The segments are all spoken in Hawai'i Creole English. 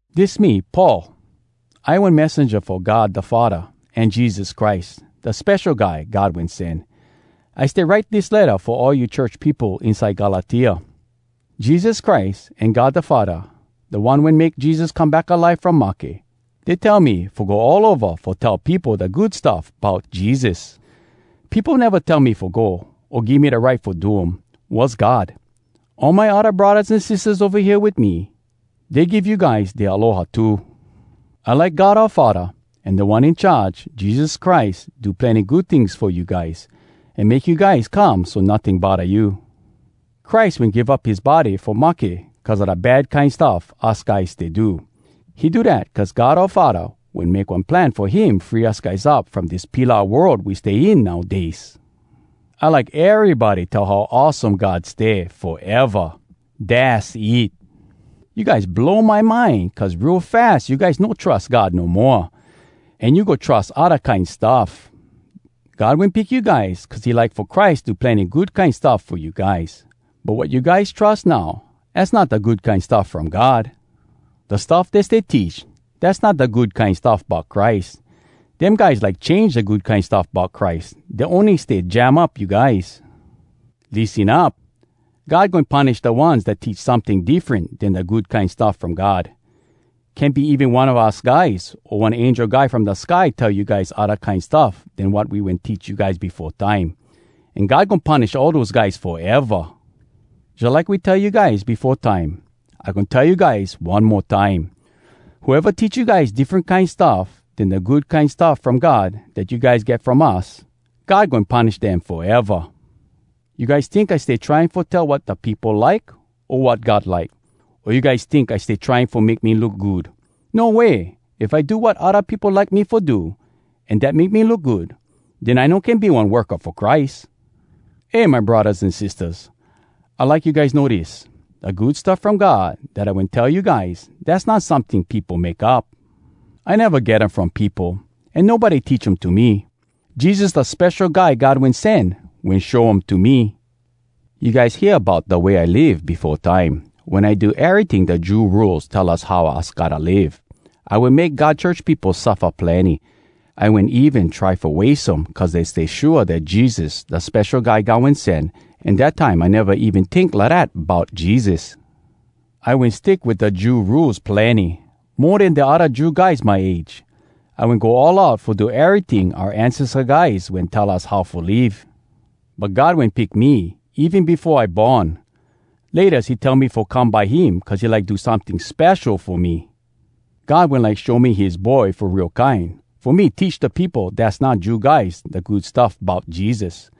Dis me, Paul. I one messenja fo God da Faddah an Jesus Christ, da Spesho Guy God Wen Sen. I stay write dis letta fo all you church peopo inside Galatia. Jesus Christ an God da Faddah, da One wen make Jesus come back alive from mahke, dey tell me fo go all ova fo tell peopo da Good Stuff Bout Jesus. Peopo neva tell me fo go, o give me da right fo do um. Was God. All my odda braddahs an sistahs ova hea wit me, dey give you guys dea aloha too. I like God oua Faddah an Da One In Charge, Jesus Christ, do plenny good tings fo you guys, an make you guys come so notting bodda you. Christ wen give up his body fo mahke cuz a da bad kine stuff us guys stay do. He do dat cuz God oua Faddah wen make one plan fo him free us guys up from dis pilau world we stay in nowdays. I like erybody tell how awesome God stay, foeva. Dass it! You guys blow my mind cuz real fas you guys no trus God no moa—an you go trus odda kine stuff! God wen pick you guys cuz he like fo Christ do plenny good kine stuff fo you guys. But wat you guys trus now, az not da Good Kine Stuff From God. Da stuff dey stay teach, dass not da Good Kine Stuff Bout Christ. Dem guys like change da Good Kine Stuff Bout Christ. Dey ony stay jam up you guys. Lissen up! God goin punish da ones dat teach someting diffren den da Good Kine Stuff From God. Can be even one a us guys o one angel guy from da sky tell you guys odda kine stuff den wat we wen teach you guys befo time. An God goin punish all dose guys foeva. Jalike we tell you guys befo time, I goin tell you guys one mo time: Whoeva teach you guys diffren kine stuff den da Good Kine Stuff From God dat you guys get from us, God goin punish dem foeva. You guys tink I stay trying fo tell wat da peopo like, o wat God like? O you guys tink I stay trying fo make me look good? No way! If I do wat odda peopo like me fo do an dat make me look good, den I no can be one worka fo Christ. Eh, my braddahs an sistahs, I like you guys know dis: da Good Stuff From God dat I wen tell you guys, dass not someting peopo make up. I neva get um from peopo, an nobody teach um to me. Jesus, da Spesho Guy God Wen Sen, wen show um to me. You guys hear bout da way I live befo time, wen I do eryting da Jew Rules tell us how us gotta live. I wen make God church peopo suffa plenny. I wen even try fo wase um cuz dey stay shua dat Jesus da Spesho Guy God Wen Sen, an dat time I neva even tink lidat bout Jesus. I wen stick wit da Jew Rules plenny, mo den da odda Jew guys my age. I wen go all out fo do eryting oua ancesta guys wen tell us how fo live. But God wen pick me even befo I born. Laytas he tell me fo come by him cuz he like do someting spesho fo me. God wen like show me his Boy fo real kine fo me teach da peopo dass not Jew guys da Good Stuff Bout Jesus.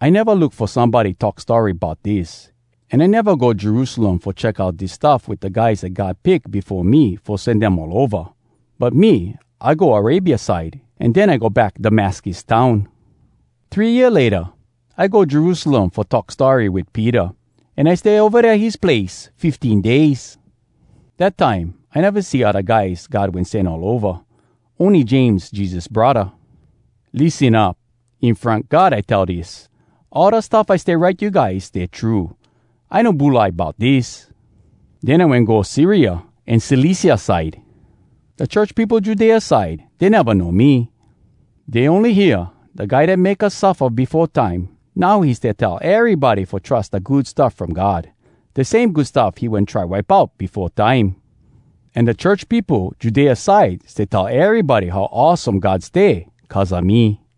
I neva look fo somebody talk story bout dis, an I neva go Jerusalem fo check out dis stuff wit da guys dat God pick befo me fo sen dem all ova. But me, I go Arabia side, an den I go back Damascus town. Three year layta, I go Jerusalem fo talk story wit Peter, an I stay ova dea his place fifteen days. Dat time I neva see odda guys God wen sen all ova, ony James, Jesus braddah. Lissen up! In front God I tell dis: all da stuff I stay write you guys stay true. I no bulai bout dis. Den I wen go Syria an Cilicia side. Da church peopo Judea side, dey neva know me. Dey ony hear, “Da guy dat make us suffa befo time, now he stay tell erybody fo trus da Good Stuff From God, da same Good Stuff he wen try wipe out befo time.” An da church peopo Judea side stay tell erybody how awesome God stay cuz a me.